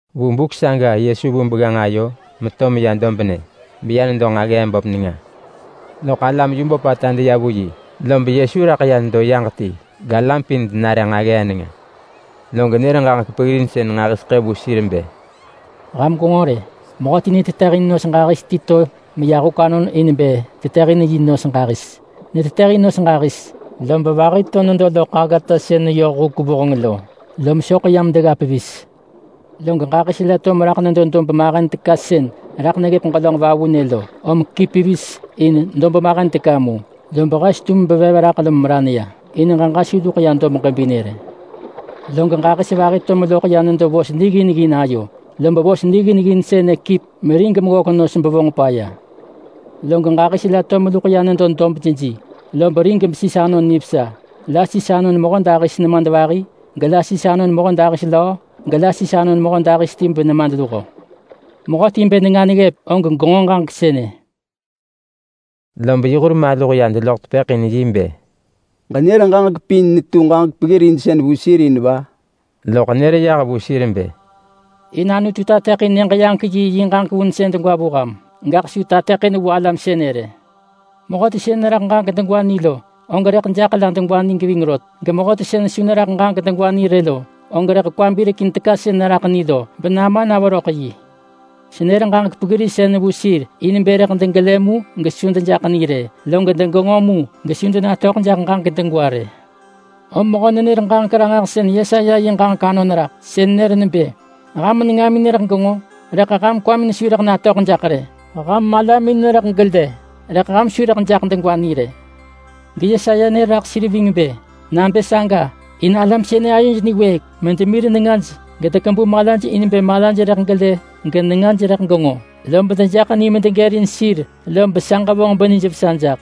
Vu buk saga Yesu vu begganġ ayo meto meya dobnë, beya nedo dus vu nġaggee böp nenga. Loḳ alam yu böpata deya vu yi, lob Yesu raḳ ya nedo yaġ ti, galam pin denare nġaggee nenga. Log nër ġaġek peggirinsën nġahiseḳë vu sir bë, “Ham gwenġo rë! Mehö netetëhin nos ġahis ti to meya huk anon in bë tetëhin yi nos ġahis. Netetëhin nos ġahis, lob vahi to nedo loḳ aggata sën neyoh huk vuheng lo, lom soḳ yam degga pevis. Log ġahis la to meraḳ nedo dob mahen teka sën raḳ neggëp ġelönġ vavunë lo, om kip pevis in dob mahen teka mu, lob hes tum bevev raḳ lom meran ya, in ġeġa su luḳ ya dob ġebinë rë. Log ġahis vahi to meloḳ ya nedo vos niggin ggin ayo, lob vos niggin ggin sënë kip merig meggök nos bevonġ paya. Log ġahis la to meluḳ ya nedo dob jeji, lob rig besis anon nivesa. La sis anon mehödahis nemadvahi, gela sis anon mehödahis löö, gela sis anon mehödahis ti benemadluho. Mehöti bë nenga neggëp, og genġo ġaġek sënë.” Lob yi hur maluh ya deloḳ tepëḳ in yi bë, “Ġenër ġaġek pin netu ġaġek peggirinsën vu sir in va?” Loḳ nër yah vu sir bë, “In Anutu tateḳin Nyëġ-yaġek-yi yi ġaġek vunsën degwa vu ham, gaḳ su tateḳin vu alam sënë rë. Mehöti sën neraḳ ġaġek degwa ni lo, og rëḳ jaḳ la degwa ni geving rot, gemehöti sën su neraḳ ġaġek degwa ni rë lo, og rëḳ kwa birekin teka sën neraḳ ni lo benama na veröḳ yi. Senër ġaġek peggirinsën vu sir in bë rëḳ degelë mu gesu dejaḳ ni rë, log degenġo mu gesu denatöḳ jaḳ ġaġek degwa rë. Om mehö-nenër-ġaġek-ranġahsën Yesaya yi ġaġek anon raḳ, sën nër nebë: ‘Ham nengamin rëḳ genġo, rëḳ ham kwamin su rëḳ natöḳ jaḳ rë. Ham malamin rëḳ gelë, rëḳ ham su rëḳ jaḳ degwa ni rë.’ GeYesaya nër raḳ sir ving bë: ‘Nabë saga, in alam sënë ayoj niwëëk, medemir nengaj gedekebu malaj in bë malaj rëḳ gelë genengaj rëḳ genġo, lob dejaḳ ni medegërin sir lob sa ġevonġ benijvesa jaḳ.’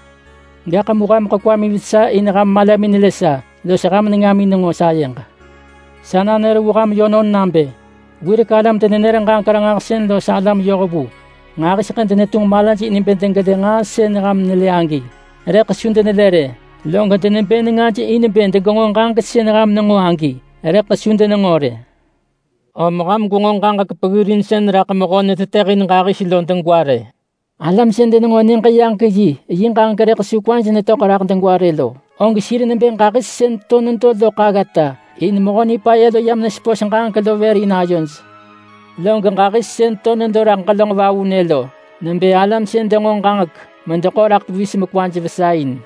Gaḳ mu hameḳ kwamin vesa in ham malamin nelë sa los ham nengamin nenġo sayeġ. Sa nanër vu ham yönon nabë: Wirek alam-denenër-ġaġek-ranġahsën los alam yohvu nġahiseḳë denetunġ malaj in bë degelë nġaa sën ham nelë agi, rëḳ su denelë rë. Log denebë nengaj in bë degenġo ġaġek sën ham nenġo agi, rëḳ su denenġo rë.” “Om ham gwenġo ġaġek peggirinsën raḳ mehö netetëhin ġahis lo degwa rë. Alam sën denenġo Nyëġ-yaġek-yi yi ġaġek rëḳ su kwaj netöḳ raḳ degwa rë lo, og sir nebë ġahis sën to nedo loḳ aggata, in Mehö Nipaya lo yam nesepos ġaġek lo vër in ayoj. Log ġahis sën to nedo raḳ ġelönġ vavunë lo, nebë alam sën denġo ġaġek medeḳo raḳ pevis mekwaj vesa in.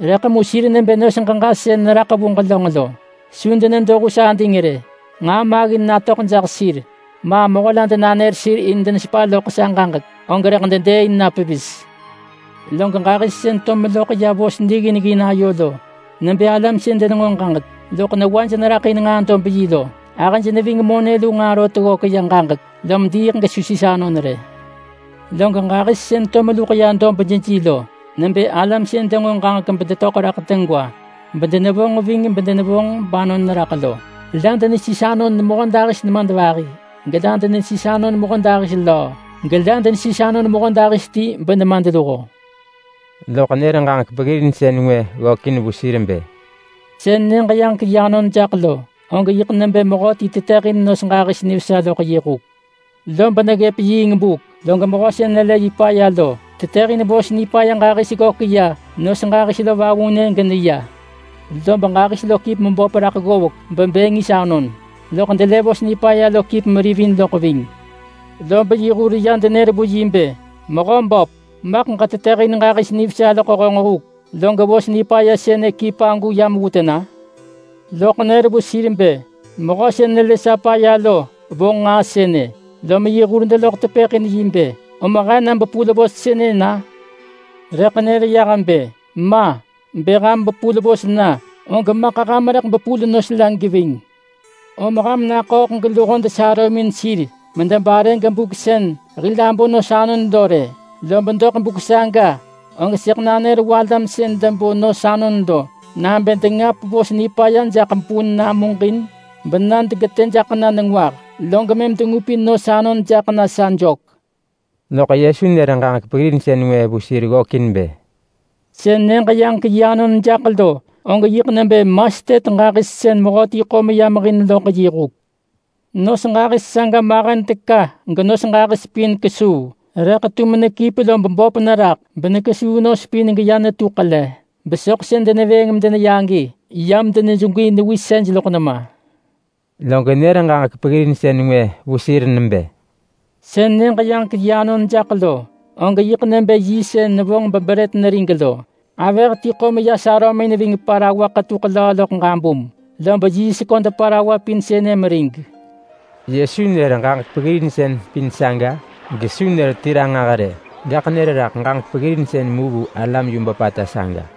Rëḳ mu sir nebë nos ġeġa sën neraḳ vu ġelönġ lo, lob su denedo hus ading rë. Bë nġaa maggin ti natöḳ jaḳ sir, ma mehö la denanër sir in desepa loḳ sa ġaġek, og rëḳ dedëëin na pevis. Log ġahis sën to meloḳ ya vos niggin ggin ayo lo, nebë alam sën denenġo ġaġek, loḳ newaj neraḳ in nġaa dob yi lo. Gahëj ving monë lu nġaa rot ggök ya ġaġek, lom diiḳ gesu sis anon rë. Log ġahis sën to meluḳ ya dob jeji lo nebë alam sën denġo ġaġek bedetöḳ raḳ degwa bedenevonġ ving bedenevonġ banon raḳ lo. La denesis anon mehödahis nemadvahi, gela denesis anon mehödahis löö, gela denesis anon mehödahis ti benemadluho.” Loḳ nër ġaġek peggirinsën ngwë ggökin vu sir bë, “Sën Nyëġ-yaġek-yi anon jaḳ lo, og yiḳ nebë mehönon ti tetëhin nos ġahis nivesa loḳ yi huk. Lob neggëp yiing buk, log mehö sën nelë yi paya lo, tetëhin vos nipaya ġahis ggök ya nos ġahis lo vavunë geneya. Lob ġahis lo kip meböp raḳ ggovek bebë ngis anon, loḳ delë vos nipaya lo kip merivin loḳ ving. Lob yi hur ya denër vu yi bë, ‘Mehö böp, maḳ ġetetëhin ġahis nivesa loḳ honġ huk, log vos nipaya sën kip agu yam vu tena?’ Loḳ nër vu sir bë, ‘Mehö sën nelë sa paya lo vonġ nġaa sënë!’ Lom yi hur deloḳ tepëḳ in yi bë, ‘Om he na bepul vos sënë na?’ Rëḳ nër yah bë, ‘Ma! Bë ham bepul vos na, og maḳ ham rëḳ bepul nos la geving. Om ham naḳööḳ geluho desarömin sir medebare gebuk sën hil abo nos anon lo rë. Lob doḳ buk saga og sëḳ nanër vu alam sën debo nos anon lo nabë dengap vos nipaya jaḳ bun namuġin bena degetë jaḳ na nengwah, log mëm dengupin nos anon jaḳ na sa jök.’” Loḳ Yesu nër ġaġek peggirinsën ngwë vu sir ggökin bë, “Sën Nyëġ-yaġek-yi anon jaḳ lo, og yiḳ nebë mastet ġahis sën mehöti ḳo meya mehin loḳ yi huk. Nos ġahis saga mahen teka genos ġahis pin kesuu, rëḳ tum nekip lob böp neraḳ benekesuu nos pin geya netu ḳele, besoḳ sën denevëëng medeneya agi yam denejegwi newisej loḳ nema.” Log nër ġaġek peggirinsën ngwë vu sir nebë, “Sën Nyëġ-yaġek-yi anon jaḳ lo, og yiḳ nebë yiist sën nevonġ bebrët nerig lo. Avëh ti ḳo meya sarömin ving parawa ḳetuḳ löö loḳ ġabum, lom yiist köd parawa pin sënë merig.” Yesu nër ġaġek peggirinsën pin saga gesu nër ti ranġah rë, gaḳ nër tu ġaġek peggirinsën mu vu alam yu böpata saga.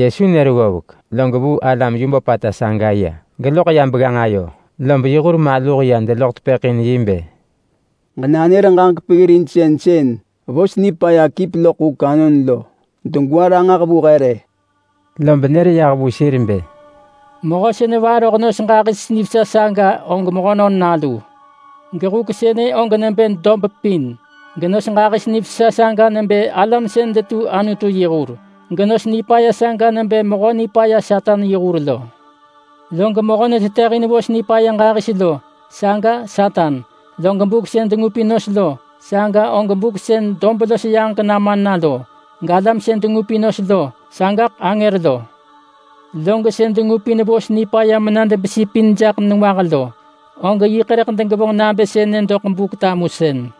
Yesu nër ggovek, log vuu alam yu böpata saga ya, geloḳ yah begganġ ayo, lob yi hur maluh ya deloḳ tepëḳ in yi bë, “Ġenanër ġaġek peggirinsën sën vos nipaya kip loḳ huk anon lo degwa ranġah vu he rë.” Lob nër yah vu sir bë, “Mehö sën nevaroh nos ġahis nivesa saga og Mehönon Nalu. Gedob pin sënë nebë huk, genos ġahis nivesa saga nebë alam sën detu Anutu yi hur, gevos nipaya saga nebë Mehö Nipaya Satan yi hur lo. Log mehö netetëhin vos nipaya ġahis lo, saga Satan. Log buk sën dengupin nos lo, saga og buk sën dob los yaġek nama na lo. Galam sën dengupin nos lo, sagaḳ angër lo. Log sën dengupin vos nipaya mena debesi pin jaḳ nengwah lo, og yiḳ rëḳ degevonġ nabë sënë doḳ Buk-tamusën.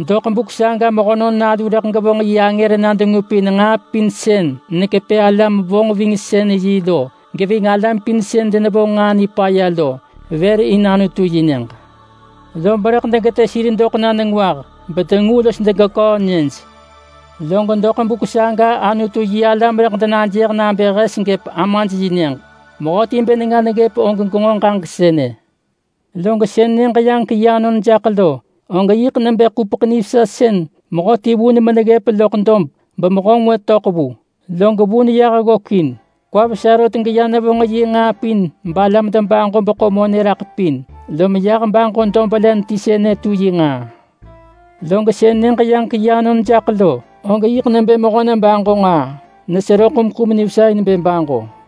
Doḳ buk saga Mehönon Nalu rëḳ gevonġ yi angër na dengupin alam nij paya pin sën depelëpin alam-vonġvingsën-yi lo geving alam pin sën denevonġ nġaa nipaya lo, bedegeḳo sir vër in Anutu-yi-Nyëġ. Lob rëḳ degetë sir doḳ na nengwah, bedengu los degeköö nyëj. Lob vu buk saga Anutu-yi-alam rëḳ denajëh nabë hes gëp Amaj-yi-Nyëġ. Mehöti bë nenga neggëp og genġo ġaġek sënë!” “Log sën Nyëġ-yaġek-yi anon jaḳ lo, og yiḳ nebë ḳupeḳ nivesa sën mehöti vun meneggëp loḳ dob bemehö ngwë töḳ vu, log vun yah ggökin. Kwa vesa rot geya nevonġ yi nġaa pin balam debaġo beḳo monë raḳ pin, lom yah baġo dob len ti sënë betu yi nġaa.” “Log sën Nyëġ-yaġek-yi anon jaḳ lo, og yiḳ nebë mehö-nebaġo-nġaa nesero ḳumḳum nivesa in bë baġo.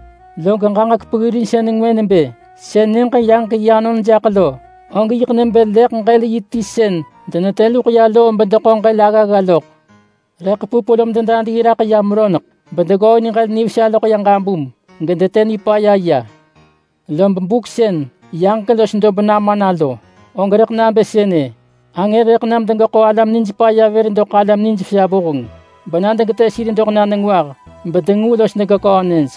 “Log ġaġek peggirinsën ngwë nebë sënë: Sën Nyëġ-yaġek-yi anon jaḳ lo, og yiḳ nebë leḳ-ġël-yi ti sën denetë luḳ ya loo beggërin ġël aggagga loḳ. Leḳ pup lom dedadii raḳ yam roneḳ, bedeggooin ġël nivesa loḳ ya ġabum, gedetë nipaya ya. Lob buk sën yaġek los dob nama na lo, og rëḳ nabë sënë. Angër rëḳ nam degeḳo alam nij paya vër doḳ alam nijvesa vuheng, bena degetë sir doḳ na nengwah, bedengu los degeköö nyëj.”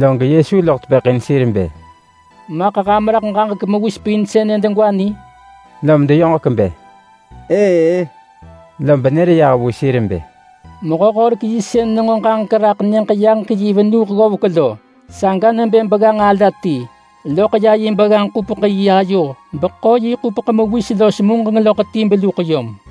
Log Yesu loḳ tepëḳ in sir bë, “Maḳ ham raḳ ġaġek mewis pin sënë degwa ni?” Lom deyoġek bë, “Ëë-ë!” Lob nër yah vu sir bë, “Mehö-horek-yi sën nenġo ġaġek raḳ Nyëġ-yaġek-yi venuh ggovek lo, saga nebë begganġ ala ti. Loḳ ya yi begganġ-ḳupeḳ-yi ayo beḳo yi ḳupeḳ mewis los muġeng loḳ ti beluḳ yom.”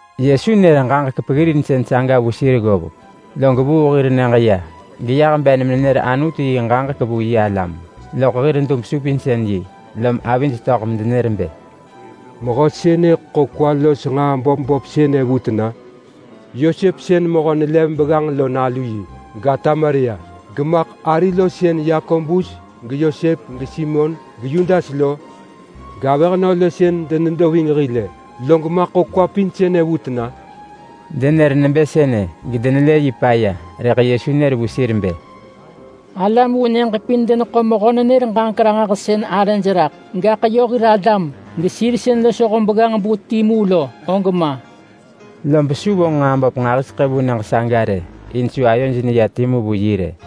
Yesu nër ġaġek peggirinsën saga vu sir ggovek log vuu hir nyëġ ya, geyah ben menenër Anutu yi ġaġek vu yi alam loḳ hir dub-supinsën-yi. Lom avij töḳ medenër bë, “Mehö sënë ḳo kwa los nġaa böp böp sënë vu tena? Yosep sën mehö nelev begganġ lo nalu yi! Gata Maria! Gemaḳ ari lo sën Yakobus geYosep geSimon geYudas lo? Gavëhnö lo sën denedo ving hil-ë! Log maḳ ḳo nġaa pin sënë vu tena?” Denër nebë sënë, log denelë yi paya. Rëḳ Yesu nër vu sir bë, “Alam vu nyëġ pin deneḳo mehö-nenër-ġaġek-ranġahsën arëj raḳ, gaḳ yö hir alam, gesir sën losho begganġ-bu timu lo, og ma!” Lob su vonġ nġaa böp nġahiseḳë vu nyëġ saga rë, in su ayoj neya timu vu yi rë.